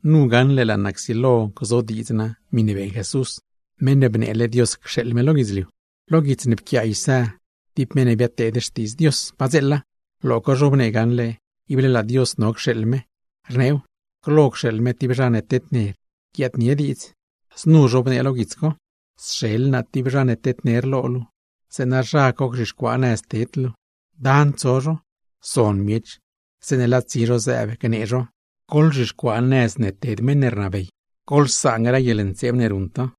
Nu gaṉle laa naa csilo gzodiidz naa, miṉe beeṉ Jesús, Meṉ ne bneele Dios cxeeḻ me lo guidzliu. Lo guits ne pquiaa Isá, tib meṉ ne biadteed xtiidz Dios padzeela, lo co zhobnee gaṉle ible laa Dios no cxeeḻ me. Rneew, glo cxeeḻ me tib zha ne tedner, guiaadnie diidz. Znu zhobnee lo guits co: Sxeḻ naa tib zha ne tedner lo luu, zeeṉa zha co gzhixcuaa nëz ne ted luu. Dan tso zho, zon miech zeeṉe laa tsi zho zëëb gnee zho: “Goḻzhixcuaa nëz ne ted meṉ ne rnabey, goḻsaan grë guieḻntseeb ne ruṉ to.”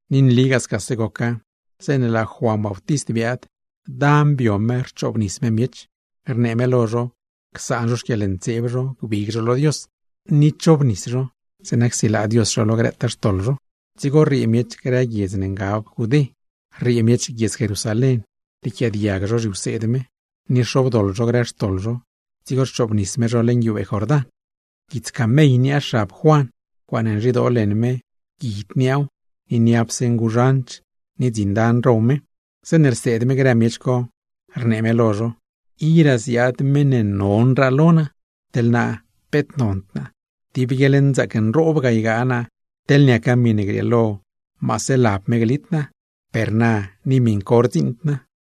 Ni nligaa scase goca, zeeṉe laa Juan Bautist biaad, dan bio me rchoobnis me miech; rnee me lo zho csaan zho xquieḻntseeb zho gbig zho lo Dios, ni chobnis zho, zeeṉa csilaa Dios zho lo grëtaa xtoḻ zho. Dzigo rriee miech grë guiedz ne ngab Judé, dib lad guiedz Jerusalén, riequiaadiag zho zhiwseed me; ni rxobdoḻ zho grë xtoḻ zho, dzigo rchoobnis me zho leṉ guiubee Jordán. Guits lad camell niaa xab me, ncuaaṉe rzhidoo leṉ me guid niaaw ni niapse nguzhanch ni dzin dan row me. Zeeṉe rseed me grë miech co, rnee me lo zho: ―Iraa ziaad meṉ ne mazdraa non lo naa. Teḻ naa peet nond naa, tib guieḻnzaac nroob ga ygaa naa teḻne niaca miṉe grieelo maase lab me glit naa; per na ni miṉ co rdziṉd naa.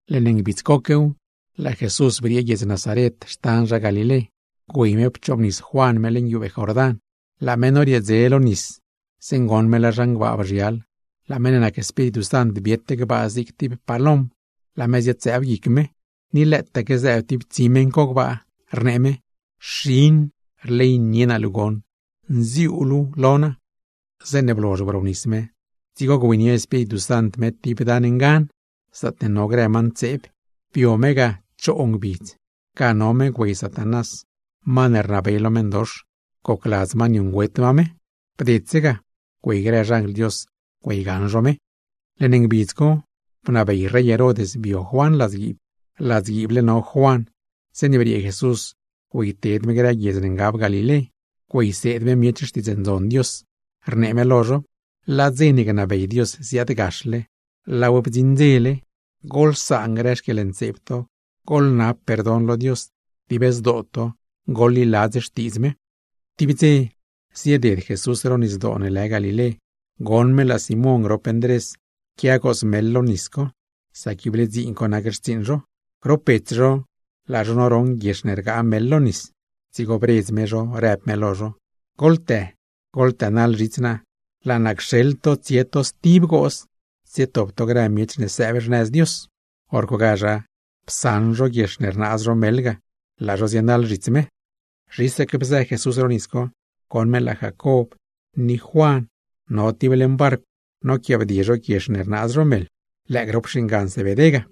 Leṉ ngbidz coquew, laa Jesús briee guiedz Nazaret xtan zha Galilé, güey me pchoobnis Juan me leṉ guiubee Jordán. Laa me norieedze lo nis, zeeṉe goṉ me laa zhan gbaa bzhial, laa meṉ ne nac Espíritu Sant biet gbaa zig tib palom laa me ziad-zëëb guic me. Ni lëëtaque zëëb tib tsi meṉ co gbaa, rnee me: ―Xin, rleynie naa luu goṉ, nziuu luu lo naa. Zeeṉe blozh brobnis me, dzigo güeynie Espíritu Sant me tib dan ngan, zaatne no grë ma ntseeb; bio me ga choo ngbidz. Ga no me güey Satanás (ma ne rnabey lo grëse meṉdox), gocladz ma niuṉgüet ma me. Bdedse ga, güey grë xanjl Dios güeygaṉ zho me. Leṉ ngbidz co bnabey Herod bio Juan ladzguiib. Ladzguiible no Juan zeeṉe briee Jesús güeyted me grë guiedz ne ngab Galilé güeyseed me miech Xtiidz Ndzon Dios, rnee me lo zho: ―Laa dze ne gnabey Dios ziaadgaxle, laaw bdziṉ dzele. ¡Goḻsaan grë xquieḻntseeb to, goḻnab perdon lo Dios; dib zdoo to goḻliladz Xtiidz me! Tib dze zieded Jesús ro Nisdoo ne lë Galilé, goṉ me laa Simón grop Ndrés quia gooz meḻ lo nis co; sac ible dziin co nac xtsiiṉ zho. Grop bets zho laa zho noroṉ guiex ne rgaa meḻ lo nis. Dzigo bredz me zho, rëb me lo zho: ―¡Goḻtë, goḻtënaḻ zhits naa! ¡Laa naa cxeḻ to tsie to stib gooz, tsietop to grë miech ne sëëb xnëz Dios! Horcogazh psaṉ zho guiex ne rnaaz zho meḻ ga, laa zho zienaḻ zhits me. Zhisaque bzë Jesús ro nis co, goṉ me laa Jacob ni Juan no tib leṉ barcw noquiaabdie zho guiex ne rnaaz zho meḻ, lëë grop xingan Zebedé ga;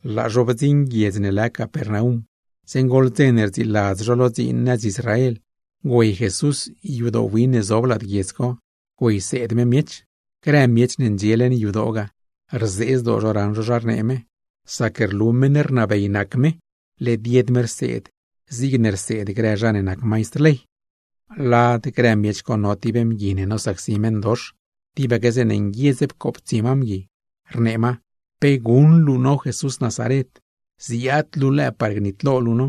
Laa zho bdziṉ guiedz ne lë Capernaum. Zeeṉe goḻ dze ne rdziiladz zho lo dziin nëz Israel, güey Jesús yadoo win ne zob lad guiedz co güeyseed me miech. Grë miech ne ndxie leṉ yadoo ga, rzee zdoo zho raṉ zho zha rnee me, sac rlu meṉ rnabey nac me; led yed me rseed zigne rseed grë zha ne nac maistr ley. Lad grë miech co no tib mgui ne nosacsi meṉdox, tibaque zeeṉe nguiedz pcooptsie ma mgui, rnee ma: ―¿Pe guṉ luu no Jesús Nazaren? ¿Ziaad luu lëë par gnitlo luu no?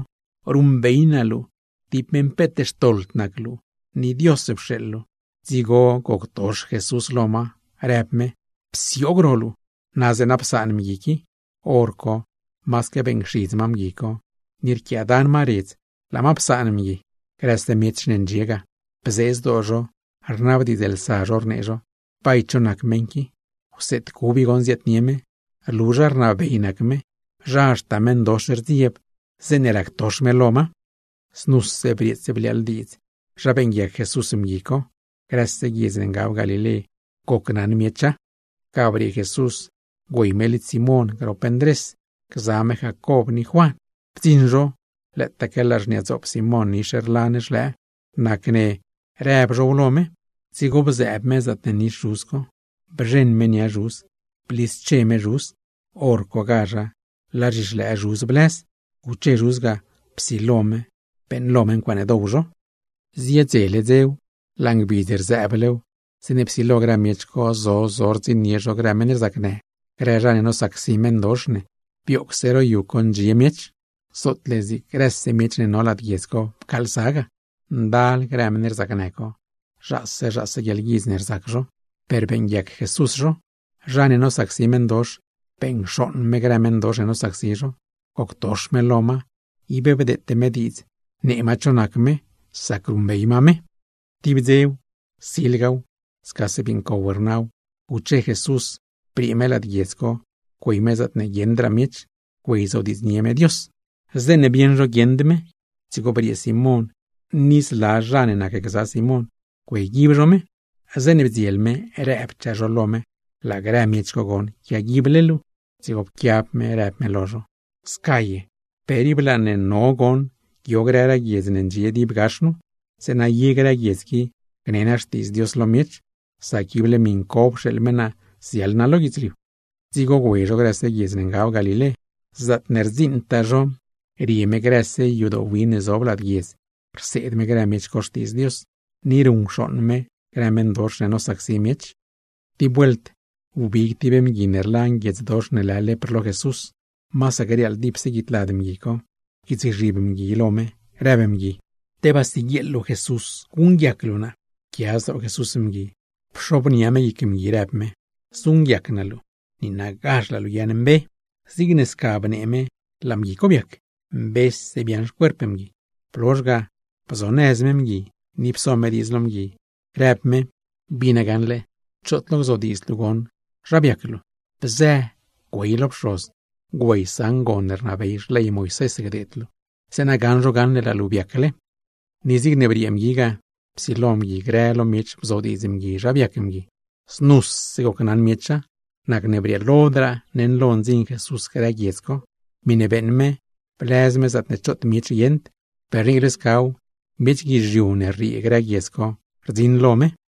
Ruṉbey naa luu, tib meṉ peet xtoḻd nac luu ni Dios pxeeḻ luu. Dzigo goctox Jesús lo ma, rëb me: ―¡Psioog ro luu! ¡Na zeeṉa psaan meṉ qui! Horco masaque beeṉcxidz ma mgui co, ni rquiaadan ma redz laa ma psaan mgui. Grëse miech ne ndxie ga, bzee zdoo zho rnabdiidzlsa zho rnee zho: ―¿Bay cho nac meṉ qui? ¡Wseed cub i goṉ ziaadnie me! ¡Rlu zha rnabey nac me, zha haxta meṉdox rdzieb zeeṉe ractox me lo ma! Znuse brieets bliaaḻ diidz zha beeṉguiac Jesús mgui co; grëse guiedz ne ngab Galilé gocnaṉ miecha. Ga briee Jesús güey me lidz Simón grop Ndrés gza me Jacob ni Juan. Bdziṉ zho, lëëtaque laa xniadzoop Simón nix rlan xlëë, nacne rëb zhow lo me. Dzigo bded me zaatne nix zhuz co, bzheṉ me nia me, blische me me. Horcogazh laa zhixlëë me blëz, guche me ga psilo me beeṉlo ncuaaṉe dow zho. Ziedzele dzew, laa ngbidz rzëëblew, zeeṉe psilo grë miech co zo zo rdziṉnie zho grë meṉ rzacnë, grë zha ne nosacsi meṉdox ne; bioogse ro yu co ndxie miech. Zootle zig grëse miech ne no lad guiedz co pcaalsa ga. Ndal grë meṉ rzacnë co zhaase zhaase guieḻguidz ne rzac zho, per beeṉguiac Jesús zho; zha ne nosacsi meṉdox, beṉcxooṉ me grë meṉdox ne nosacsi zho. Goctox me lo ma, ib bdeete me diidz nee ma cho nac me, sac ruṉbey ma me. Silgaw, scase bii ncow rnaw guche Jesús briee me lad guiedz co, güey me zaatne guieṉdraa miech, güeyzodiidznie me Dios. Zeeṉe rnit me choot guieṉd; dzigo briee Simón ni zla zha ne nacgza Simón güeyguib zho me. Zeeṉe bdziel me, rëbchaa zho lo me laa grë miech co quiaguible me. Dzigo pquiab me rëb me lo zho: ―¡Sca ye! Per ib laa ne none goṉ guio grëraa guiedz ne ndxie dib gax nu, zeeṉa ye grë guiedz qui gnee naa Xtiidz Dios lo miech; sac ible miṉ co pxeeḻ me naa ziaḻ naa lo guidzliu. Dzigo güey zho grëse guiedz ne ngab Galilé. Zaatne rdziṉtaa zho, rie me grëse yadoo win ne zob lad guiedz rseed me grë miech co Xtiidz Dios, ni ruṉcxooṉ me grë meṉdox ne nosacsi miech. Tib vuelt, wbig tib mgui ne rlan guiedzdox ne lë lepr lo Jesús (masaque riaaḻ dipse guid lad mgui), pquiitsgzhib mgui lo me, rëb mgui: ―Tebaa siguieeḻ luu guṉguiac luu naa. Pquia zdoo Jesús mgui, pxobnia me guic mgui rëb me: ―Zuṉguiac naa luu. ¡Niinagazh laa luu guiaaṉmbe! Zigne sca bnee me laa mgui co biac, mbese biaaṉ xcuerp mgui. Blozh ga bzonëz me mgui, ni pso me diidz lo mgui rëb me: ―Bina gaṉle, choot lo gzodiidzd luu goṉ zha biac luu. Bzë, güey lo pxoz, güeysaṉ gon ne rnabey xley Moisés gdeed luu; zeeṉa gaṉ zho gaṉle laa luu biacle. Ni zigne briee mgui ga, psilo mgui grë lo miech bzodiidz mgui zha biac mgui. Grëse miech gocnaṉa, nacne brieelodraa neṉlo ndziṉ Jesús grë lad guiedz co. Miṉe beeṉ me, blëz me zaatne choot miech guieṉd; per niicle scaw, miech guizhiu ne rriee grë guiedz co rdziṉ lo me.